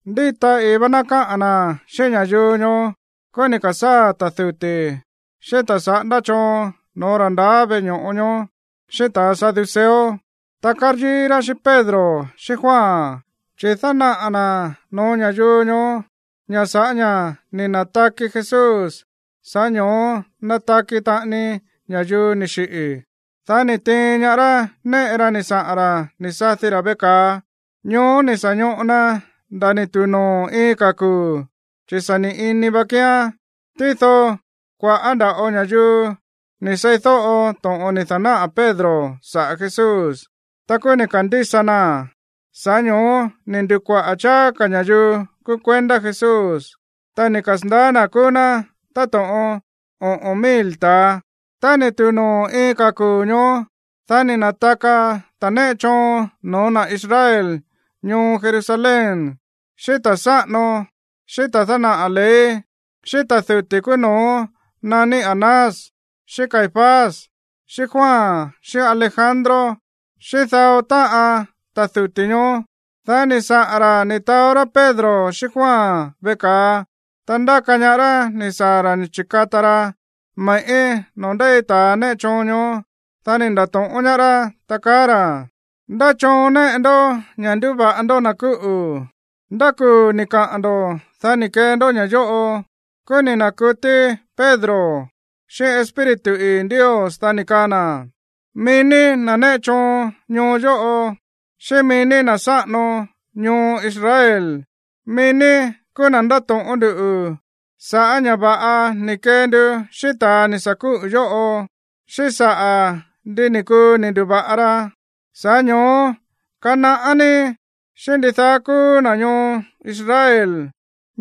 Ndíta ii̱ vá ná káꞌa̱n na̱ xíꞌín ña̱yuu ñoó, kúú ni̱ ka̱sáa̱ ta̱ duti̱, xíꞌín ta̱ saꞌándá choon no̱ó ra̱ ndaá veꞌe ño̱ꞌo ñoó, xíꞌín ta̱ saduceo. Ta káryíí rá xíꞌín Pedro xíꞌín Juan chi̱ dánaꞌa̱ na̱ no̱ó ña̱yuu ñoó ña̱ sa̱ꞌá ña̱ ni̱ na̱taki Jesús, sa̱ꞌá ño̱ó nataki taꞌani ña̱yuu ni̱ xiꞌi̱. Dá ni̱ tiin ñaá rá néꞌe ra ni̱ saꞌa̱n ra̱ ni̱ sadi ra̱ veꞌe ka̱a. Ñoó ni̱ sa̱ ñoꞌo na nda̱ ni̱ tu̱u noo̱ iin ka̱ kuu̱, chi̱ sa̱ ni̱ ini va kíán. Tído kua̱ꞌá nda̱ꞌo ña̱yuu ni̱ seídóꞌo to̱ꞌon ni̱ da̱náꞌa̱ Pedro saꞌa̱ Jesús, ta kúú ni̱ ka̱ndísa naa̱n. Sa̱ꞌá ño̱ó ni̱ ndu̱kuaꞌa̱ cháá ka̱ ña̱yuu kúú kuendá Jesús, ta ni̱ kasa̱ndaá na̱ kúú ná táto̱ꞌon oꞌo̱n mil ta̱a. Tá ni̱ tu̱u noo̱ iin ka̱ kuu̱ ñoó, dá ni̱ na̱taka ta̱a néꞌe choon no̱ó na̱ Israel ñoo Jerusalén, xíꞌín ta̱ sáꞌano, xíꞌín ta̱ dánaꞌa̱ ley, xíꞌín ta̱ duti̱ kúú no̱ó naní Anás, xíꞌín Caifás, xíꞌín Juan, xíꞌín Alejandro, xíꞌín dao táꞌan ta̱ duti̱ ñoó. Dá ni̱ saꞌa̱n ra̱ ni̱ taó rá Pedro xíꞌín Juan veꞌe ka̱a, ta ndáka ñaá rá ni̱ saa̱ ra̱ ni̱ chi̱kata ra me̱ꞌí noo̱ ndéi ta̱ néꞌe choon ñoó. Dá ni̱ nda̱to̱ꞌón ñaá rá, ta kaá ra̱: ―¿Ndá choon néꞌe ndoꞌó ña̱ ndúva̱ꞌa ndó na̱ kúꞌu̱? ¿Ndá kuu̱ ni̱ kaꞌa̱n ndo̱, dá ni̱ kee ndó ña̱ yóꞌo? Kúú ni̱ na̱kutí Pedro xíꞌín Espíritu ii̱ Ndios, dá ni̱ kaa na̱: ―Mií ní, na̱ néꞌe choon ñoo yóꞌo, xíꞌín mií ní, na̱ sáꞌano ñoo Israel, mií ní kúú na̱ ndáto̱ꞌón nduꞌu̱ sa̱ꞌá ña̱ va̱ꞌa ni̱ kee ndu xíꞌín ta̱a ni̱ sa̱ kúꞌu̱ yóꞌo, xíꞌín saꞌa̱ ndi ni̱ kuu ni̱ ndu̱va̱ꞌa ra. Sa̱ꞌá ño̱ó kanaꞌá ní, xíꞌín ndidaá kúú na̱ ñoo Israel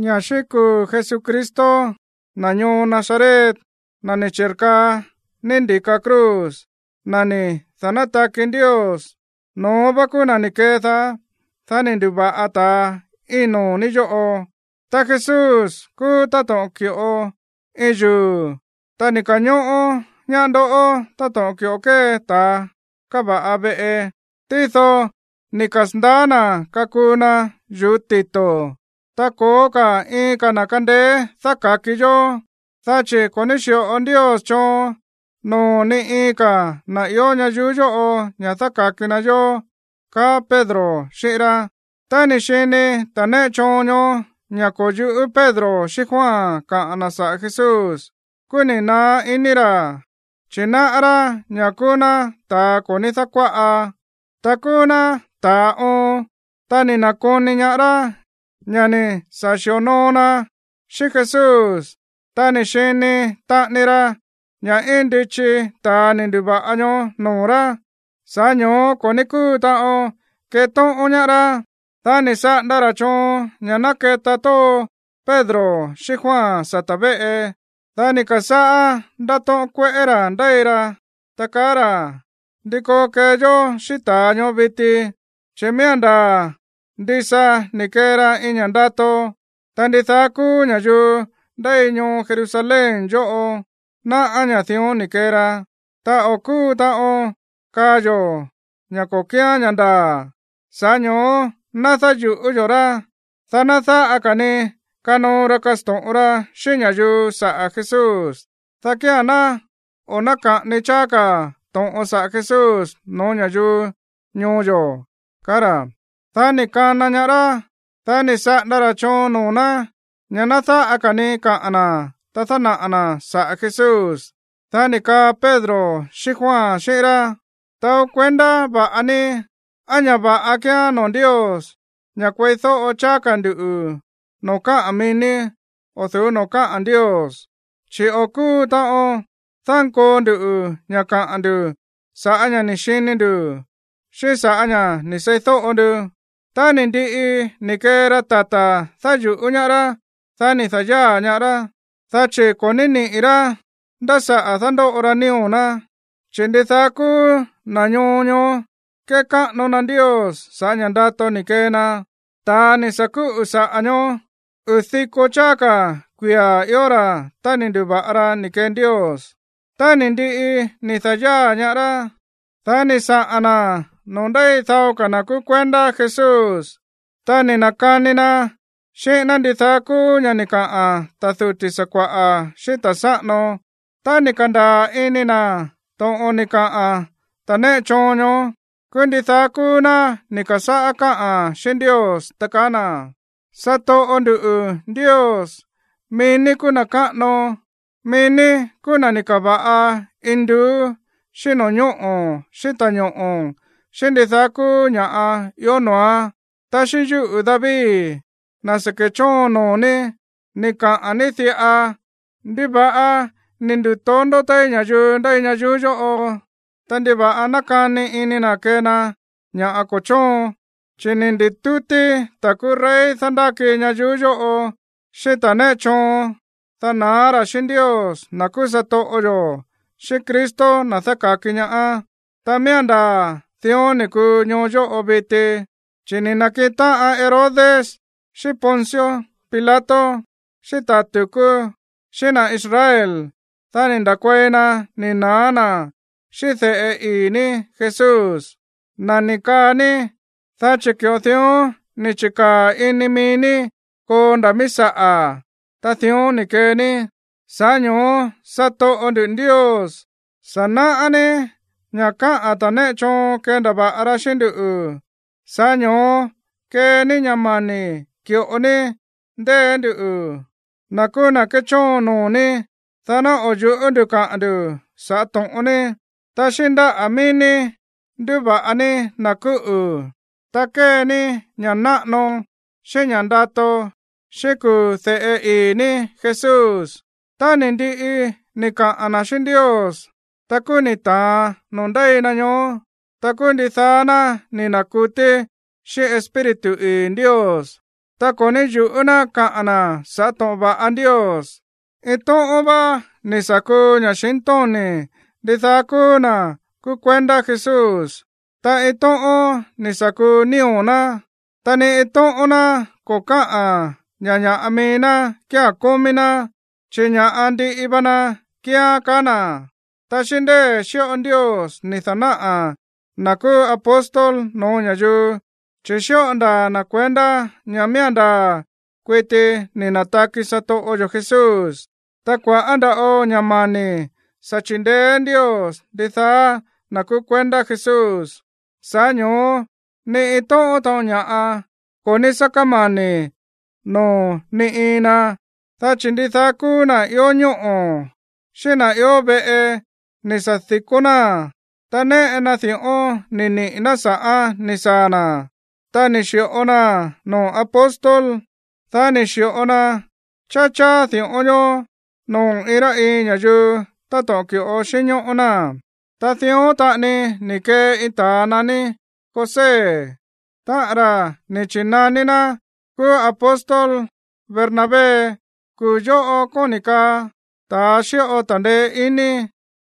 ña̱ xíꞌín kuu̱ Jesucristo, na̱ ñoo Nazaret, na̱ ni̱ chi̱rkaa ní ndi̱ka cruz, na̱ ni̱ da̱nátaki Ndios, no̱ón vá kúú na̱ ni̱ kedaá, dá ni̱ ndu̱va̱ꞌa ta̱a íin noo̱ ní yóꞌo. Ta Jesús kúú táto̱ꞌon ki̱ꞌo iin yuu̱, ta ni̱ ka̱ñóꞌó ñaá ndoꞌó táto̱ꞌon ki̱ꞌo kée ta̱ kava̱ꞌa veꞌe. Tído ni̱ kasa̱ndaá na̱ kakuu na yu̱ú tito̱. Ta ko̱ó ka̱ iin ka̱ na̱ kándéé dáka̱ki yó, dá chi̱ ko̱ ní xíꞌo Ndios choon noo̱ ni iin ka̱ na̱ ió ñayuú yóꞌo ña̱ dáka̱ki na yó ―kaá Pedro xíꞌín rá. Tá ni̱ xini ta̱ néꞌe choon ñoó ña̱ ko̱ yu̱ꞌú Pedro xíꞌín Juan kaꞌa̱n na̱ saꞌa̱ Jesús, kúú ni̱ naá iní ra̱, chi̱ náꞌá rá ña̱ kúú ná ta̱a ko̱ ní dákuáꞌa, ta kúú ná ta̱a oon. Ta ni̱ na̱koni ñaá rá ña̱ ni̱ sa̱ xi̱onoo na xíꞌín Jesús. Ta ni̱ xini taꞌani ra ña̱ íin ndichi ta̱a ni̱ ndu̱va̱ꞌa ñoó noo̱ rá, sa̱ꞌá ño̱ó ko̱ ní kúu taꞌon ketóꞌón ñaá rá. Dá ni̱ saꞌanda ra̱ choon ña̱ ná keta tóo Pedro xíꞌín Juan sata̱ véꞌe. Dá ni̱ ka̱sáꞌá ndátóꞌón kueꞌé ra̱ ndéi ra, ta kaá ra̱: ―¿Ndí koo kee yó xíꞌín ta̱a ñoó viti? Chi̱ miía̱n ndaa̱ ndisa ni̱ kee ra iin ña̱ꞌa ndato, ta ndidaá kúú ña̱yuu ndéi ñoo Jerusalén yóꞌo náꞌá ña̱ dión ni̱ kee ra. Ta o̱ kúu taꞌon kaa yo̱ ña̱ ko̱ kíán ña̱ ndaa̱. Sa̱ꞌá ño̱ó ná dáyu̱ꞌú yo̱ rá, dá ná dáꞌa ka̱ ni kanoo ra kasto̱ꞌon ra xíꞌín ña̱yuu saꞌa̱ Jesús, dá kía̱n ná o̱ náka̱ꞌani cháá ka̱ to̱ꞌon saꞌa̱ Jesús no̱ó ña̱yuu ñoo yo̱ ―kaá ra̱. Dá ni̱ kana ñaá rá. Dá ni̱ saꞌanda ra̱ choon noo̱ ná ña̱ ná dáꞌa ka̱ ní kaꞌa̱n na̱, ta dánaꞌa̱ na̱ saꞌa̱ Jesús. Dá ni̱ kaa Pedro xíꞌín Juan xíꞌín rá: ―Taó kuendá va̱ꞌa ní, á ña̱ va̱ꞌa kíán noo̱ Ndios ña̱ kueídóꞌo cháá ka̱ nduꞌu̱ noo̱ káꞌa̱n mií ní o̱ du̱ú noo̱ káꞌa̱n Ndios. Chi̱ o̱ kúu taꞌon dánkoo nduꞌu̱ ña̱ kaꞌa̱n ndu̱ sa̱ꞌá ña̱ ni̱ xini ndu̱, xíꞌín sa̱ꞌá ña̱ ni̱ seídóꞌo ndu. Tá ni̱ ndiꞌi ni̱ kee ra tata̱ dáyu̱ꞌú ñaá rá, dá ni̱ da̱yáa̱ ñaá rá, dá chi̱ ko̱ ní niꞌi̱ rá nda̱ saꞌa̱ dándóꞌo ra nío̱ ná, chi̱ ndidaá kúú na̱ ñoo ñoó kékáꞌano na Ndios sa̱ꞌá ña̱ ndato ni̱ kee na. Ta̱a ni̱ sa̱ kúꞌu̱ saꞌa̱ ñoó, uu̱ diko cháá ka̱ kuia̱ ió ra̱ tá ni̱ ndu̱va̱ꞌa ra ni̱ kee Ndios. Tá ni̱ ndiꞌi ni̱ da̱yáa̱ ñaá rá, dá ni̱ saꞌa̱n na̱ noo̱ ndéi dao ka̱ na̱ kúú kuendá Jesús. Ta ni̱ na̱kani na xíꞌín ná ndidaá kúú ña̱ꞌa ni̱ kaꞌa̱n ta̱ duti̱ sakua̱ꞌa̱ xíꞌín ta̱ sáꞌano. Tá ni̱ ka̱ndaa̱ ini na̱ to̱ꞌon ni̱ kaa ta̱ néꞌe choon ñoó, kúú ndidaá kúú ná ni̱ ka̱sáꞌá káꞌa̱n xíꞌín Ndios, ta kaá na̱: ―Satoꞌo ndu̱ Ndios, mií ní kúú na̱ káꞌano. Mií ní kúú na̱ ni̱ ka̱va̱ꞌa induú xíꞌín no̱ñóꞌo̱ xíꞌín ta̱ñoꞌo̱, xíꞌín ndidaá kúú ña̱ꞌa ió noo̱án. Ta xíꞌín yúꞌu̱ David, na̱ sa̱ ke̱chóon noo̱ ní, ni̱ kaꞌa̱n ní diꞌa: ¿Ndiva̱ꞌa ni̱ nduto̱ndó téí ña̱yuu ndéi ñayuú yóꞌo? Ta, ¿ndiva̱ꞌa nákani ini na̱ kee na ña̱ ko̱ chóon? Chi̱ ni̱ ndi̱tútí ta̱ kúú rey dándáki ñayuú yóꞌo, xíꞌín ta̱ néꞌe choon, dá na̱á ra̱ xíꞌín Ndios, na̱ kúú satoꞌo yo̱, xíꞌín Cristo, na̱ dáka̱ki ñaá. ’Ta miía̱n ndaa̱ dión ni̱ kuu ñoo yóꞌo viti, chi̱ ni̱ na̱kiꞌin táꞌan Herodes xíꞌín Poncio Pilato, xíꞌín ta̱ tu̱kú, xíꞌín na̱ Israel. Dá ni̱ nda̱kuei na ni̱ na̱á na̱ xíꞌín de̱ꞌe ii̱ ní Jesús, na̱ ni̱ kaa ní. Dá chi̱ ki̱ꞌo dión ni̱ chi̱kaa̱ ini mií ní koo nda̱ mií saꞌa̱, ta dión ni̱ kee ní. Sa̱ꞌá ño̱ó, satoꞌo ndu̱ Ndios, sa̱ náꞌá ní ña̱ káꞌa̱n ta̱ néꞌe choon kendava̱ꞌa ra xíꞌín nduꞌu̱. Sa̱ꞌá ño̱ó kee ní ña̱ mani̱ ki̱ꞌo ní ndée̱ nduꞌu̱, na̱ kúú na̱ kéchóon noo̱ ní, dá ná o̱ yu̱ꞌú nduꞌu̱ kaꞌa̱n ndu̱ saꞌa̱ to̱ꞌon ní. Ta xíꞌín ndáꞌa̱ mií ní nduva̱ꞌa ní na̱ kúꞌu̱. Ta kee ní ña̱ꞌa náꞌano xíꞌín ña̱ꞌa ndato xíꞌín kuu̱ de̱ꞌe ii̱ ní Jesús. Tá ni̱ ndiꞌi ni̱ kaꞌa̱n na̱ xíꞌín Ndios, ta kúú ni̱ ta̱an noo̱ ndéi na ñoó. Ta kúú ndidaá ná ni̱ na̱kutí xíꞌín Espíritu ii̱ Ndios. Ta ko̱ ní yu̱ꞌú na̱ kaꞌa̱n na̱ sa̱ꞌá to̱ꞌon va̱ꞌa Ndios. Iin tóꞌón vá ni̱ sa̱ kuu ña̱xintóni̱ ndidaá kúú na̱ kúú kuendá Jesús, ta iin tóꞌón ni̱ sa̱ kuu nío̱ ná. Ta ni iin tóꞌón ná ko̱ káꞌa̱n ña̱ ña̱ꞌa mií ná kía̱n kómí ná, chi̱ ña̱ꞌa ndiꞌi va na kíán, kaá na̱. Ta xíꞌín ndée̱ xíꞌo Ndios ni̱ da̱náꞌa̱ na̱ kúú apóstol no̱ó ña̱yuu, chi̱ xíꞌo ndaa̱ na̱ kuendá ña̱ miía̱n ndaa̱ kuiti ni̱ na̱taki satoꞌo yo̱ Jesús. Ta kua̱ꞌá nda̱ꞌo ña̱ mani̱ sa̱ chindeé Ndios ndidaá na̱ kúú kuendá Jesús, sa̱ꞌá ño̱ó ni iin tóꞌón taꞌon ña̱ꞌa ko̱ ní sá kámani̱ noo̱ ni iin na. Dá chi̱ ndidaá kúú na̱ ió ñóꞌo̱, xíꞌín na̱ ió veꞌe ni̱ sa̱ di̱kó náa̱n, ta néꞌe na di̱ꞌón ni̱ niꞌi̱ ná sa̱ꞌán ni̱ saa̱ na̱, ta ni̱ xi̱ꞌo naa̱n noo̱ apóstol, dá ni̱ xi̱ꞌo na cháá cháá di̱ꞌón ñoó noo̱ iin rá iin ña̱yuu táto̱ꞌon ki̱ꞌo xínñóꞌó náa̱n. Ta dión taꞌani ni̱ kee iin ta̱a naní José, táꞌa̱n ra̱ ni̱ chi̱naní na̱ kúú apóstol Bernabé. Kuu̱ yóꞌo kóni̱ kaa ta̱a xíꞌo ta̱ndeé iní.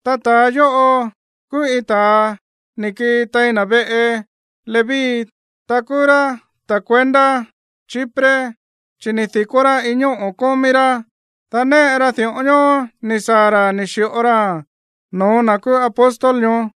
Ta ta̱a yóꞌo kúú iin ta̱a ni̱ kii tein na̱ veꞌe Leví. Ta kúú rá ta̱ kuendá Chipre. Chi̱ ni̱ di̱kó rá iin ñóꞌo̱ kómí rá. Dá néꞌe ra di̱ꞌón ñoó ni̱ saa̱ ra̱ ni̱ xi̱ꞌo raa̱n no̱ó na̱ kúú apóstol ñoó.